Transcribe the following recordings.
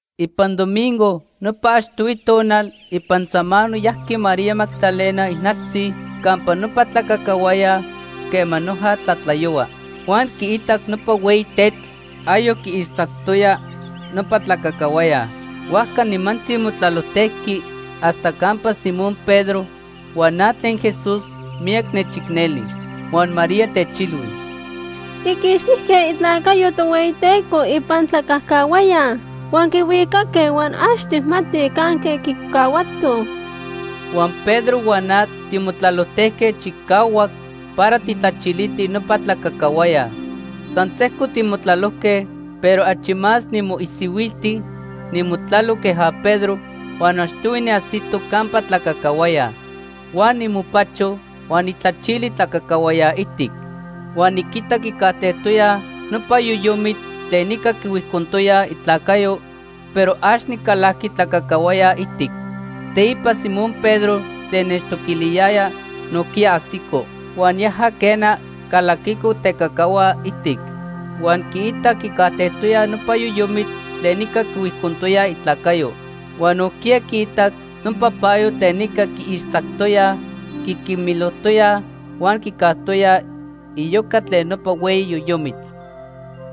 Ipan domingo nopa achtohui tonal ipan samano yajqui María Magdalena ijnaltzi campa nopa tlacacahuaya quema noja tlatlayohua. Huan quiitac nopa hueyi tetl ayoc quiixtzactoya nopa tlacacahuaya. Huajca nimantzi motlalojtejqui hasta campa Simón Pedro huan na tlen Jesús miyac nechicneli. Huan María techilhui: ―Quiquixtijque itlacayo Tohueyiteco ipan tlacacahuaya huan quihuicaque huan ax tijmatij canque quicahuatoj. Huan Pedro huan na timotlalojtejque chicahuac para tijtlachilitij nopa tlacacahuaya. San sejco timotlalojque, pero achi más nimoisihuilti nimotlalo queja Pedro huan achtohui niajsito campa tlacacahuaya. Huan nimopacho huan nijtlachili tlacacahuaya ijtic. Huan niquitac quicajtejtoya nopa yoyomitl tlen ica quihuijcontoyaj itlacayo, pero ax nicalajqui tlacacahuaya ijtic. Teipa Simón Pedro tlen nechtoquiliyaya, nojquiya ajsico. Huan yaja, quena, calaquico tecacahua ijtic huan quiitac quicajtejtoya nopa yoyomitl tlen ica quihuijcontoyaj itlacayo. Huan nojquiya quiitac nopa payo tlen ica quiixtzactoyaj, quiquimilojtoyaj huan quicajtoya iyoca tlen nopa hueyi yoyomitl.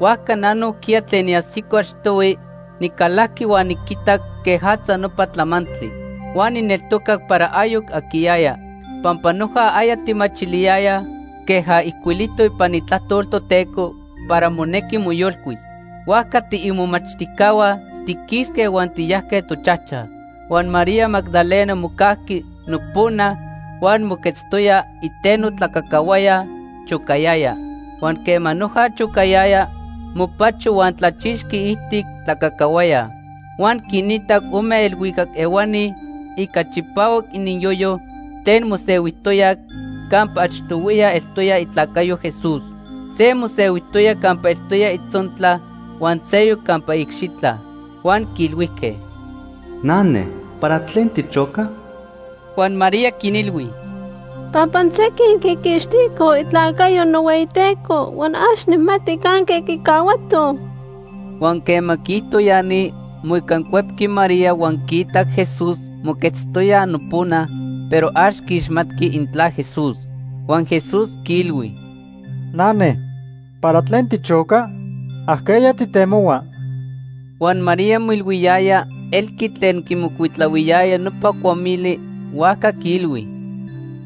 Huajca na nojquiya tlen niajsico achtohui nicalajqui huan niquitac quejatza nopa tlamantli. Huan nijneltocac para ayoc aquiyaya. Pampa noja aya tijmachiliyayaj queja ijcuilijtoc ipan Itlajtol Toteco para monejqui moyolcuis. Huajca tiimomachtijcahua tiquisque huan tiyajque tochajchaj. Huan María Magdalena mocajqui nopona huan moquetztoya iteno tlacacahuaya chocayaya. Huan quema noja chocayaya, mopacho huan tlachixqui iijtic tlacacahuaya. Huan quinitac ome elhuicac ehuani ica chipahuac ininyoyo tlen mosehuijtoyaj campa achtohuiya eltoya itlacayo Jesús. Se mosehuijtoya campa eltoya itzontla huan seyoc campa iicxitla. Huan quiilhuijque: ―Nane, ¿para tlen tichoca? Huan María quinilhui: ―Pampa sequin quiquixticoj itlacayo nohueyiTeco huan ax nijmati canque quicahuatoj. Huan quema quiijto ya ni, moicancuepqui María huan quiitac Jesús moquetztoya nopona, pero ax quiixmatqui intla Jesús. Huan Jesús quiilhui: ―Nane, ¿para tlen tichoca? ¿Ajqueya tijtemohua? Huan María moilhuiyaya elqui tlen quimocuitlahuiyaya nopa cuamili, huajca quiilhui: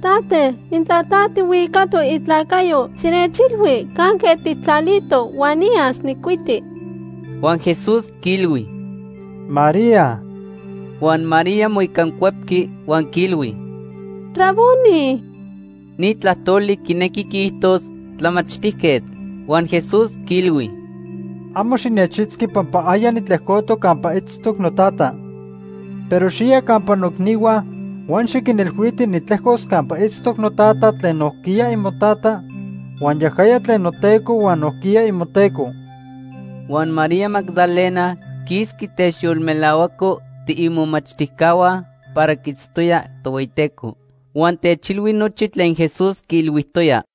―Tate, intla ta tijhuicatoc itlacayo, xinechilhui canque tijtlalito huan niyas nijcuiti. Huan Jesús quiilhui: ―¡María! Huan María moicancuepqui huan quiilhui: ―¡Raboni! (Ni tlajtoli quinequi quiijtos: ‘Tlamachtijquetl’.) Huan Jesús quiilhui: ―Amo xinechitzqui pampa aya nitlejcotoc campa itztoc noTata. Pero xiya campa noicnihua huan xiquinilhuiti nitlejcos campa itztoc noTata tlen nojquiya imoTata huan yajaya tlen noTeco huan nojquiya imoTeco. Huan María Magdalena quisqui techyolmelahuaco tiimomachtijcahua para quiitztoya Tohueyiteco. Huan techilhui nochi tlen Jesús quiilhuijtoya.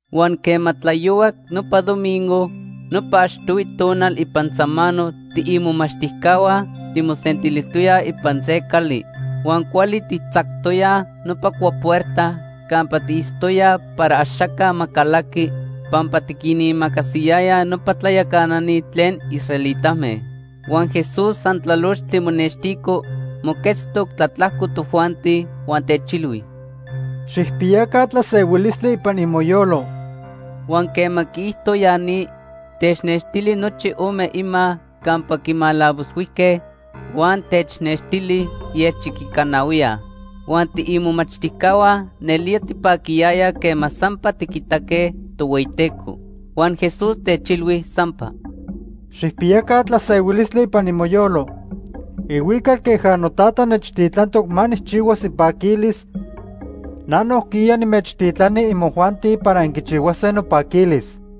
Huan quema tlayohuac nopa domingo, nopa achtohui tonal ipan samano tiimomachtijcahua timosentilijtoyaj ipan se cali. Huan cuali tijtzactoyaj nopa cuapuerta campa tiitztoyaj para axaca ma calaqui pampa tiquinimacasiyayaj nopa tlayacanani tlen israelitame. Huan Jesús san tlalochtli monextico, moquetztoc tlatlajco tojuanti huan techilhui: ―Xijpiyaca tlasehuilistli ipan imoyolo. Huan quema quiijto ya ni, technextili nochi ome ima campa quimalavoshuijque huan technextili ielchiquicanahuiya. Huan tiimomachtijcahua nelía tipaquiyayaj quema sampa tiquitaque Tohueyiteco. Huan Jesús techilhui sampa: ―Xijpiyaca tlasehuilistli ipan imoyolo. Ihuical queja noTata nechtitlantoc ma nijchihuas ipaquilis, na nojquiya nimechtitlani imojuanti para inquichihuase nopaquilis.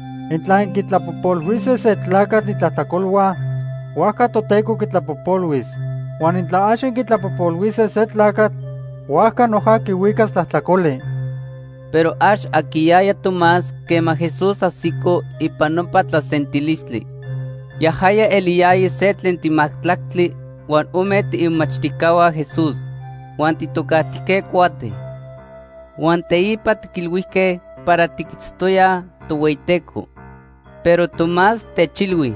Intla inquitlapojpolhuise se tlacatl itlajtlacolhua, huajca Toteco quitlapojpolhuis. Huan intla ax inquitlapojpolhuise se tlacatl, huajca noja quihuicas tlajtlacoli. Pero ax aquiyaya Tomás quema Jesús ajsico ipan nopa tlasentilistli. Yajaya eliyaya se tlen timajtlactli huan ome tiimomachtijcahua Jesús huan tijtocajtijque Cuate. Huan teipa tiquilhuijque para tiquitztoyaj Tohueyiteco. Pero Tomás techilhui: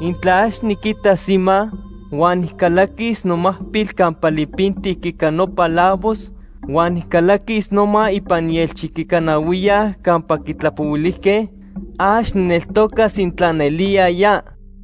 ―Intla ax niquitas ima, huan nijcalaquis nomacpil campa lipintic ica nopa lavos huan nijcalaquis noma ipan ielchiquicanahuiya campa quitlapohuilijque, ax nijneltocas intla nelía ya.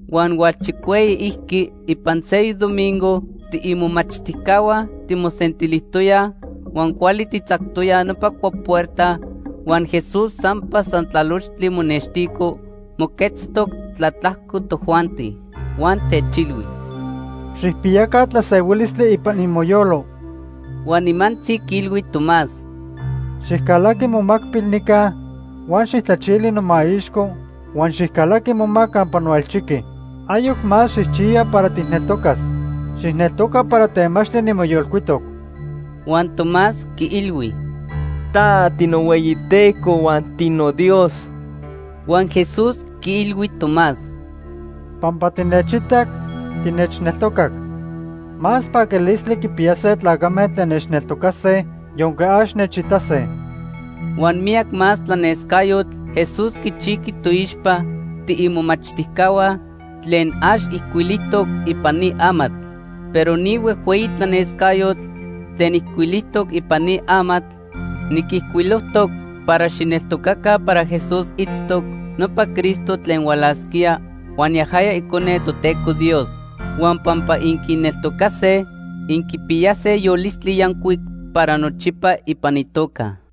Huan hualchicueyiijqui ipan seyoc domingo tiimomachtijcahua timosentilijtoyaj huan cuali tijtzactoyaj nopa cuapuerta huan Jesús sampa san tlalochtli monextico, moquetztoc tlatlajco tojuanti. Huan techilhui: ―Xijpiyaca tlasehuilistli ipan imoyolo. Huan nimantzi quiilhui Tomás: ―Xijcalaqui momacpil nica huan xijtlachili nomaixco huan xijcalaqui moma campa noelchiqui. Ayoc más xijchiya para tijneltocas. Xijneltoca para temachtli nimoyolcuitoc. Huan Tomás quiilhui: ―Ta tinohueyiTeco huan tinoDios. Huan Jesús quiilhui Tomás: ―Pampa tinechitac, tinechneltocac. Más paquilistli quipiyase tlacame tlen nechneltocase yonque ax nechitase. Huan miyac más tlanescayotl Jesús quichijqui toixpa tiimomachtijcahua tlen ax ijcuilijtoc ipan ni amatl. Pero ni huejhueyi tlanescayotl tlen ijcuilijtoc ipan ni amatl, niquijcuilojtoc para xijneltocaca para Jesús itztoc nopa Cristo tlen hualasquía huan yajaya Icone Toteco Dios. Huan pampa inquineltocase, inquipiyase yolistli yancuic para nochipa ipan itoca.